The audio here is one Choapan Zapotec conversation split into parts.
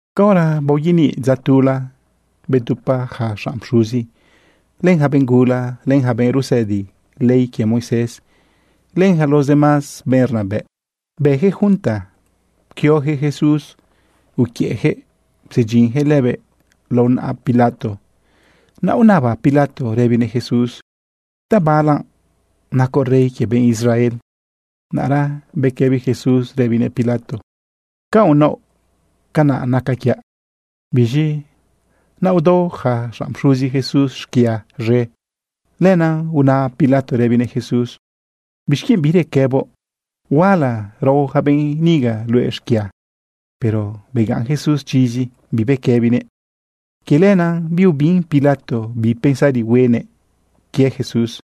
Caora baoyaniꞌ dza tula, bedupa yaca xanꞌ pxuzi, len yaca benꞌ gula, len yaca benꞌ rusëdi ley quie Moisés, len yaca los demás benꞌ rnabëꞌ, bëyaquëꞌ junta. Pquioyaquëꞌ Jesús uquiëꞌyaquëꞌ psedyinyaquëꞌ lëbëꞌ lao naꞌa Pilato. Naꞌ unaba Pilato rëbinëꞌ Jesús: ―¿Tabala nacoꞌ rey quie benꞌ Israel? Naꞌra bequëbi Jesús rëbinëꞌ Pilato: ―Ca unaoꞌ, canaꞌ nacaꞌ quiaꞌ. Biz̃i naꞌ udao yaca xanꞌ pxuzi Jesús xquia z̃e. Lenaꞌ una Pilato rëbinëꞌ Jesús: ―¿Bixquienꞌ birequëboꞌ? Huala rao yaca benꞌ niga luëꞌ xquia. Pero begaꞌn Jesús chizi, bibequëbinëꞌ. Quie lenaꞌ biubin Pilato bi pensari huenëꞌ quie Jesús.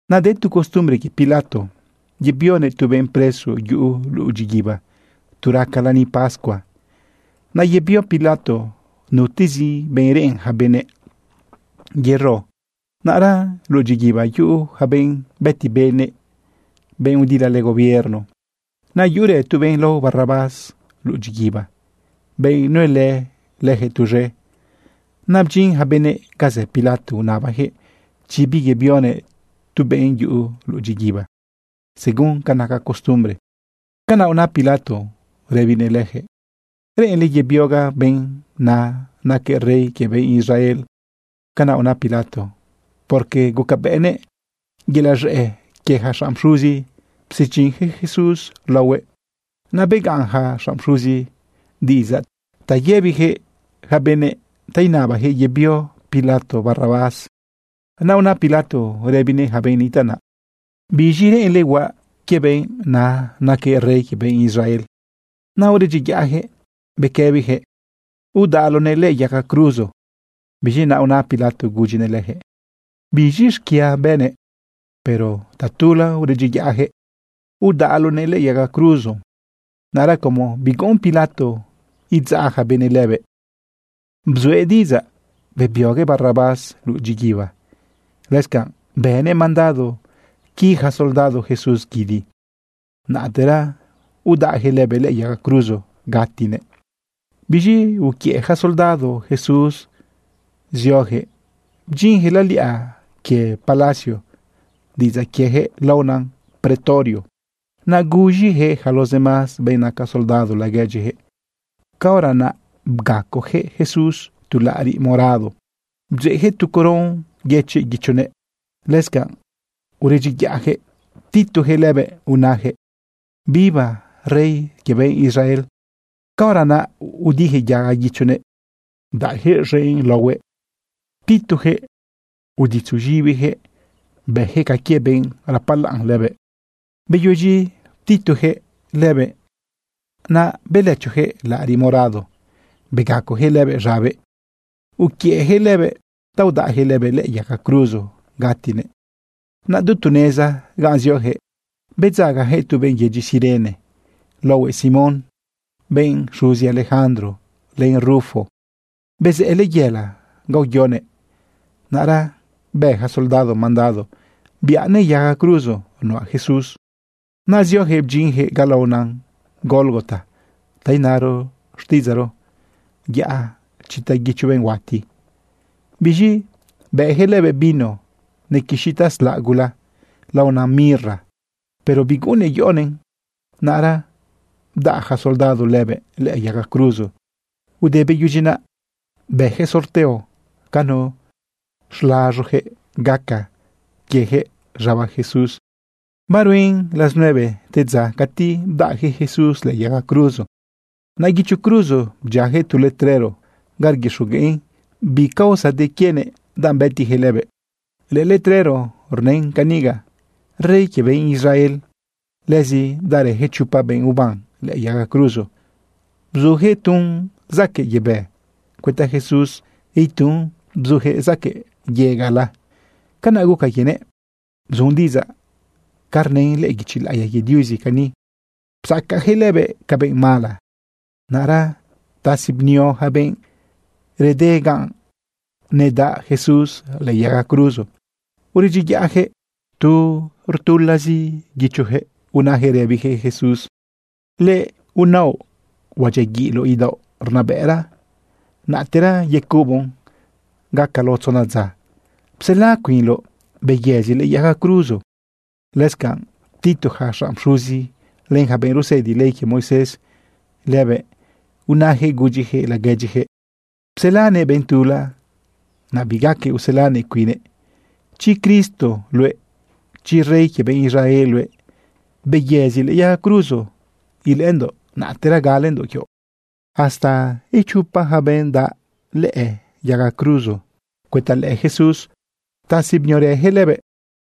Naꞌ de tu costumbre quie Pilato yebionëꞌ tu benꞌ preso yuꞌu luꞌu dyiguiba tu raca lani pascua. Naꞌ yebio Pilato nutezi benꞌ reꞌen yaca benëꞌ yero. Naꞌra luꞌu dyiguiba yuꞌu yaca benꞌ bëti benëꞌ, benꞌ udilalë gobierno. Naꞌ yuꞌurë tu benꞌ lao Barrabás luꞌu dyiguiba, benꞌ nuelë leyaquëꞌ tuz̃e. Naꞌ bdyin yaca benëꞌ ga zë Pilato unabayaquëꞌ chi biyebionëꞌ tu benꞌ yuꞌu luꞌu dyiguiba según ca naca costumbre. Canaꞌ una Pilato rëbinëꞌ leyaquëꞌ: ―¿Reꞌenle yebiogaꞌ benꞌ na naquëꞌ rey quie benꞌ Israel? Canaꞌ una Pilato, porque gucabëꞌnëꞌ yelaꞌ z̃ëꞌ quie yaca xanꞌ pxuzi psedyinyaquëꞌ Jesús laohuëꞌ. Naꞌ begaꞌn yaca xanꞌ pxuzi diꞌidzaꞌ ta yëbiyaquëꞌ yaca benëꞌ ta inabayaquëꞌ yebio Pilato Barrabás. Naꞌ una Pilato rëbinëꞌ yaca benꞌ nitaꞌ naꞌ: ―¿Biz̃i reꞌenle huaꞌ quie benꞌ na naquëꞌ rey quie benꞌ Israel? Naꞌ uredyiyaꞌyaquëꞌ bequëbiyaquëꞌ: ―¡Udaꞌloꞌnëꞌ lëꞌë yaga cruzo! Biz̃i naꞌ una Pilato gudyinëꞌ leyaquëꞌ: ―¿Biz̃i xquia bënëꞌ? Pero tatula uredyiyaꞌyaquëꞌ: ―Udaꞌloꞌnëꞌ lëꞌë yaga cruzo. Naꞌra como biguꞌun Pilato idzaꞌ yaca benëꞌ lëbëꞌ, bzuëꞌ diꞌidzaꞌ bebioguëꞌ Barrabás luꞌu dyiguiba. Lëscanꞌ bënëꞌ mandado qui yaca soldado Jesús guidi, naꞌtera udaꞌyaquëꞌ lëbëꞌ lëꞌë yaga cruzo gatinëꞌ. Biz̃i uquiëꞌ yaca soldado Jesús zioyaquëꞌ bdyinyaquëꞌ laliꞌa quie palacio (diꞌidzaꞌ quieyaquëꞌ laona pretorio). Naꞌ guz̃iyaquëꞌ yaca los demás benꞌ naca soldado laguedyiyaquëꞌ. Caora naꞌ bgacoyaquëꞌ Jesús tu laꞌariꞌ morado, bdzeꞌyaquëꞌ tu coron yëchiꞌ guichonëꞌ. Lëscanꞌ uredyiyaꞌyaquëꞌ ptituyaquëꞌ lëbëꞌ unayaquëꞌ: ―¡Viva rey quie benꞌ Israel! Caora naꞌ udiyaquëꞌ yaga guichonëꞌ, bdaꞌyaquëꞌ z̃enꞌ laohuëꞌ, ptituyaquëꞌ uditzu z̃ibiyaquëꞌ bëyaquëꞌ ca quie benꞌ rapalaꞌn lëbëꞌ. Beyudyi ptituyaquëꞌ lëbëꞌ, naꞌ belëchoyaquëꞌ laꞌariꞌ morado, begacoyaquëꞌ lëbëꞌ z̃abëꞌ, uquiëꞌyaquëꞌ lëbëꞌ ta udaꞌyaquëꞌ lëbëꞌ lëꞌë yaga cruzo gatinëꞌ. Naꞌ du tu neza ganꞌ zioyaquëꞌ, bedzagayaquëꞌ tu benꞌ yedyi Cirene laohuëꞌ Simón, benꞌ xuzi Alejandro len Rufo. Bezëꞌë layela ga uyoguëꞌ. Naꞌra bë yaca soldado mandado biꞌanëꞌ yaga cruzo nuꞌa Jesús. Naꞌ zioyaquëꞌ bdyinyaquëꞌ ga laona Gólgota (ta inaro xtiꞌidzaꞌro: Yaꞌa chita guicho benꞌ huati). Biz̃i bëꞌyaquëꞌ lëbëꞌ vino nequixi taslaꞌ gula laona mirra, pero biguꞌunnëꞌ yoꞌonëꞌn. Naꞌra bdaꞌ yaca soldado lëbëꞌ lëꞌë yaga cruzo. Te beyudyi naꞌ, bëyaquëꞌ sorteo ca nu xlaz̃oyaquëꞌ gaca quieyaquëꞌ z̃aba Jesús. Baruen las nueve te dza cati bdaꞌyaquëꞌ Jesús lëꞌë yaga cruzo. Naꞌ guicho cruzo bdyiayaquëꞌ tu letrero ga rguixogueꞌn bi causa de quienëꞌ danꞌ bëtiyaquëꞌ lëbëꞌ. Lëꞌë letrero rnën caniga: “Rey quie benꞌ Israel.” Lëzi bdaꞌrëyaquëꞌ chopa benꞌ uban lëꞌë yaga cruzo. Bzuyaquëꞌ tun zaquëꞌ yebë cuëta Jesús, itun bzuyaquëꞌ zaquëꞌ yegaꞌla. Canaꞌ guca quienëꞌ bzun diꞌidzaꞌ ca rnën lëꞌë guichi laꞌiya quie Diuzi cani: “Psacayaquëꞌ lëbëꞌ ca benꞌ mala.” Naꞌra ptasi bnio yaca benꞌ rede ganꞌ nedaꞌ Jesús lëꞌë yaga cruzo. Uredyiyaꞌyaquëꞌ tu rtulazi guichoyaquëꞌ unayaquëꞌ rëbiyaquëꞌ Jesús: ―Luëꞌ naoꞌ huadyiaguiꞌloꞌ idaoꞌ rnabëꞌra, naꞌtera yecuboꞌn gaca lao tzona dza, psela cuinloꞌ, beyëzi lëꞌë yaga cruzo. Lëscanꞌ ptitu yaca xanꞌ pxuzi len yaca benꞌ rusëdi ley quie Moisés lëbëꞌ, unayaquëꞌ gudyiyaquëꞌ laguedyiyaquëꞌ: ―Pselanëꞌ benꞌ tula, naꞌ bigaquëꞌ uselanëꞌ cuinnëꞌ. Chi Cristo luëꞌ, chi rey quie benꞌ Israel luëꞌ, beyëzi lëꞌë yaga cruzo ilëꞌëndoꞌ, naꞌtera galendoꞌ quioꞌ. Hasta ichopa yaca benꞌ nedaꞌlë yaga cruzo cuëta lëꞌë Jesús, ptasi bniorëyaquëꞌ lëbëꞌ.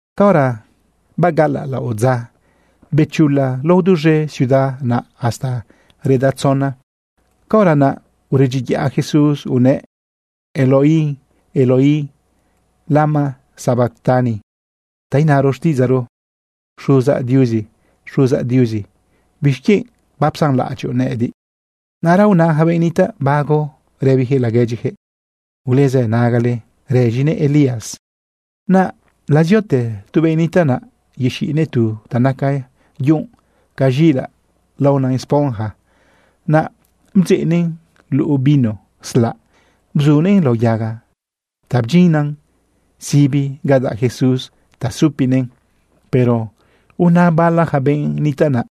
Caora bagaꞌalaꞌ laꞌodza, bechula lao duz̃e ciudad naꞌ hasta reda tzona. Caora naꞌ uredyiyaꞌ Jesús unëꞌ: ―Eloi, Eloi, ¿lama sabactani? ―ta inaro xtiꞌidzaꞌro: Xuzaꞌ Diuzi, Xuzaꞌ Diuzi, ¿bixquienꞌ bapsanlaꞌadyoꞌ nëꞌëdiꞌ? Naꞌra una yaca benꞌ nitaꞌ bago rëbiyaquëꞌ laguedyiyaquëꞌ: ―Ulezë nagale, rëz̃inëꞌ Elías. Naꞌ laziote tu benꞌ nitaꞌ naꞌ yexiꞌnëꞌ tu ta naca yunꞌ ca z̃iꞌilaꞌ laona esponja. Naꞌ bdzeꞌnëꞌn luꞌu vino slaꞌ bzunëꞌn lao yaga ta bdyinnan sibi ga daꞌ Jesús ta supinëꞌn. Pero una bala yaca benꞌ nitaꞌ naꞌ: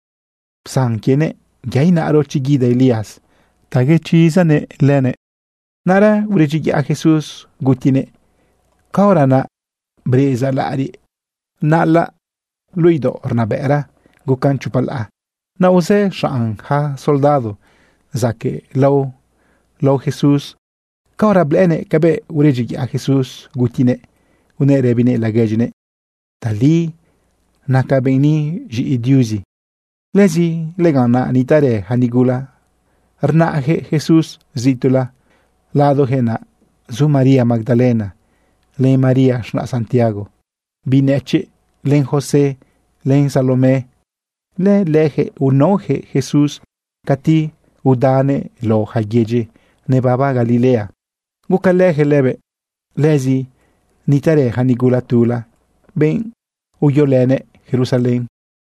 ―Psan quienëꞌ. Yaꞌ inaꞌro chi guida Elías ta uchizanëꞌ lëbëꞌ. Naꞌra uredyiyaꞌ Jesús gutinëꞌ. Caora naꞌ, breꞌeza laꞌariꞌ naꞌalan luꞌu idaoꞌ rnabëꞌra, gucan chopa laꞌa. Naꞌ uzë xanꞌ yaca soldado zaquëꞌlao lao Jesús. Caora blëꞌënëꞌ cabëꞌ uredyiyaꞌ Jesús gutinëꞌ, unëꞌ rëbinëꞌ laguedyinëꞌ: ―Tali naca benꞌ ni z̃iꞌi Diuzi. Lëzi lëganꞌ naꞌ nitaꞌrë yaca nigula rnaꞌyaquëꞌ Jesús zituꞌla. Ladoyaquëꞌ naꞌ zu María Magdalena, len María z̃naꞌ Santiago biꞌ nëchiꞌ, len José, len Salomé. Lëleyaquëꞌ unaoyaquëꞌ Jesús cati udanëꞌ lao yaca yedyi nebaba Galilea gucalëyaquëꞌ lëbëꞌ. Lëzi nitaꞌrë yaca nigula tula, benꞌ uyolënëꞌ Jerusalén.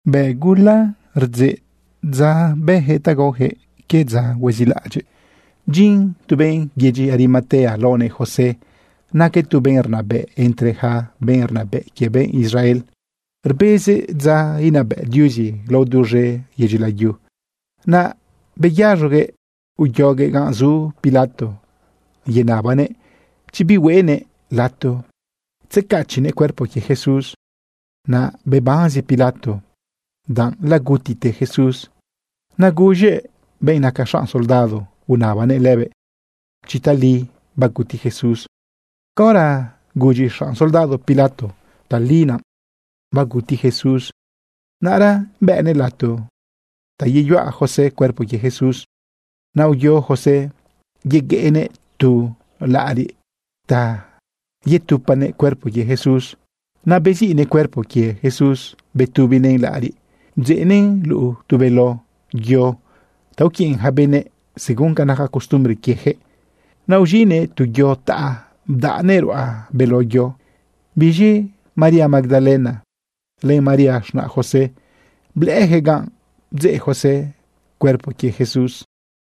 Naꞌ gula rdzeꞌ dza bëyaquëꞌ ta gaoyaquëꞌ quie dza huezilaꞌadyiꞌ. Bdyin tu benꞌ yedyi Arimatea laonëꞌ José. Naquëꞌ tu benꞌ rnabëꞌ entre yaca benꞌ rnabëꞌ quie benꞌ Israel. Rbezëꞌ dza inabëꞌ Diuzi lao duz̃e yedyi layu. Naꞌ beyaz̃oguëꞌ uyoguëꞌ ga zu Pilato yenabanëꞌ chi bihueꞌnëꞌ lato tzecachiꞌnëꞌ cuerpo quie Jesús. Naꞌ bebanzi Pilato lagutite Jesús. Naꞌ guz̃ëꞌ benꞌ naca xanꞌ soldado unabanëꞌ lëbëꞌ chi tali baguti Jesús. Caora gudyi xanꞌ soldado Pilato tali naꞌ baguti Jesús, naꞌra bëꞌnëꞌ lato ta yeyuꞌa José cuerpo quie Jesús. Naꞌ uyo José yegueꞌnëꞌ tu laꞌariꞌ ta yetupanëꞌ cuerpo quie Jesús. Naꞌ beziꞌnëꞌ cuerpo quie Jesús betubinëꞌn laꞌariꞌ, bdzeꞌnëꞌn luꞌu tu beló yo ta uquiꞌn yaca benëꞌ según ca naca costumbre quieyaquëꞌ. Naꞌ uz̃iꞌnëꞌ tu yo taꞌa, bdaꞌnëꞌn ruꞌa beló yo. Biz̃i María Magdalena, len María z̃naꞌ José, blëꞌëyaquëꞌ ganꞌ bdzëꞌ José cuerpo quie Jesús.